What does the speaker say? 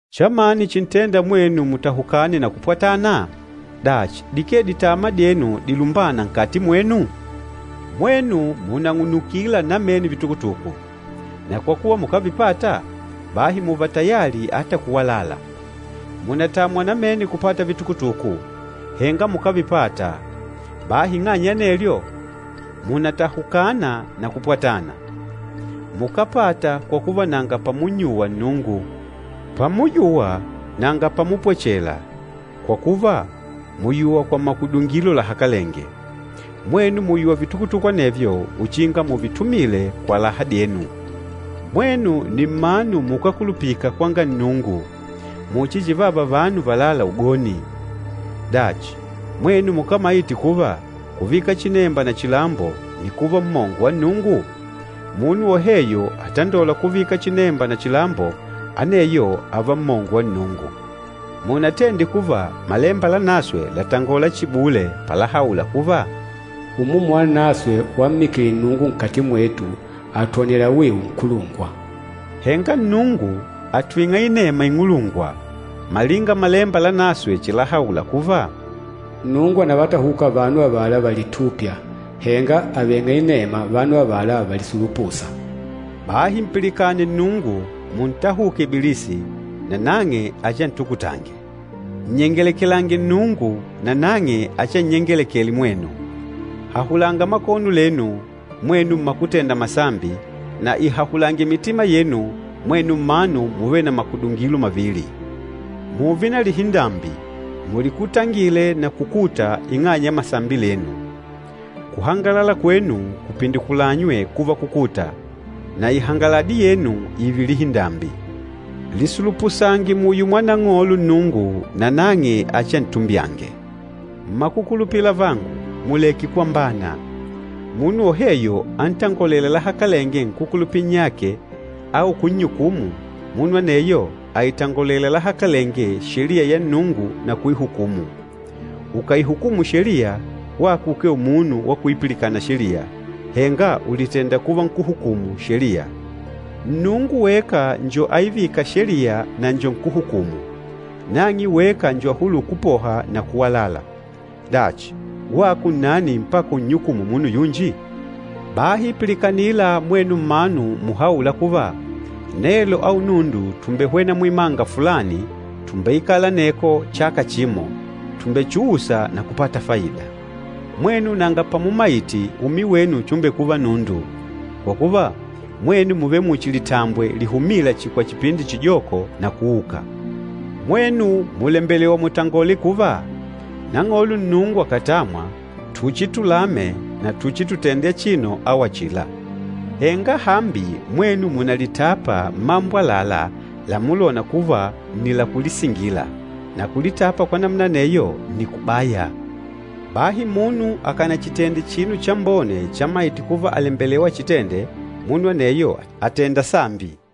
Chamani chintênda mwenu mutahukane na kupwatana? Dachi, dikee ditama dyenu dilumbâna nkati mwenu? Mwenu mùnang'unukila namene vitukutuku, na kwa kuva mukávipata, bahi mùùva tayali ata kuwalala. Mùnatamwa namene kupata vitukutuku, henga mukávipata, bahi ing'anya ya anelyo, mùnatahukana na kupwatana. Mukápata kwa kuva nanga pamunnyuwa Nnungu. Pamuyuwa, nanga pamupwechela, kwa kuva mùyuwa kwa makudungilo lahakalenge. Mwenu mùyuwa vitukutuku anevyo uchinga muvitumile kwa laha dyenu. Mwenu nni mmanu mukákulupika kwanga Nnungu, muchi chivava vanu valâla ugoni! Dachi, mwenu mukámaite kuva, kuvika chinemba na chilambo nni kuva mmongo wa Nnungu? Munu woheyo atandôla kuvika chinemba na chilambo, aneyo ààva mmongo wa Nnungu. Munatende kuva Malemba Lanaswe làtangola chihi bule, palahaula kuva, “Umumu Wanaswe wammikile Nnungu nkati mwetu àtwonela wiu nkulungwa.” Henga Nnungu àtwing'a inema ing'ulungwa. Malinga Malemba Lanaswe chilahaula kuva, “Nnungu ànavatahuka vanu avala valitûpya, henga àveng'a inema vanu avala valisulupûsa.” Bahi mpilikane Nnungu. Muntahuke Ibilisi, nanang'e achiantukutange. Nnyengelekelange Nnungu nanang'e achiannyengelekele mwenu. Hahulanga makono lenu, mwenu mmakutenda masambi, na ihahulange mitima yenu mwenu mmanu muvêle na makudungilo mavili! Mùùve na lihindambi, mulikutangile na kukuta ing'anya ya masambi lenu. Kuhangalala kwenu kupindikulanywe kuva kukuta, na ihangaladi yenu ììve lihindambi. Lisulupusange muyo mwa Nang'olo Nnungu, nanang'e achiantumbyange. Mmakukulupila avangu, muleke kwambana. Munu woheyo antangolêla lahakalenge nkúkulupila nnyake au kunnyukumu, munu aneyo àitangolela lahakalenge Sheliya ya Nnungu na kuihukumu. Ukàihukumu Sheliya, wako ukee umunu wa kuipilikana Sheliya, henga ùlitenda kuva nkúhukumu Sheliya. Nnungu weka njo aivîka Sheliya na njo nkúhukumu. Nang'e weka njo ahulûla kupoha na kuwalala. Dachi, wako nnani mpaka unnyukumu munu yunji? Bahi pilikanila mwenu mmanu muhaûla kuva, “Nelo au nundu tùmbehwena muimanga fulani, tùmbeikala aneko chaka chimo, tùmbechuusa na kupata faida.” Mwenu nanga pamumaite umi wenu chumbekuva nundu! Kwa kuva, mwenu mùvele muchi litambwe lihumîla chihi kwa chipindi chijoko na kuuka. Mwenu mùlembelewa mutangole kuva, “Nang'olo Nnungu akàtamwa tuchitulame na tuchitutende achino au achila.” Henga hambi mwenu mùnalitapa mmambo àlalá lamulona kuva nni lakulisingila, na kulitapa kwa namuna aneyo nni kubaya. Bahi munu akánachitende chinu chambone chamaite kuva àlembelewa achitende, munu aneyo àtenda sambi.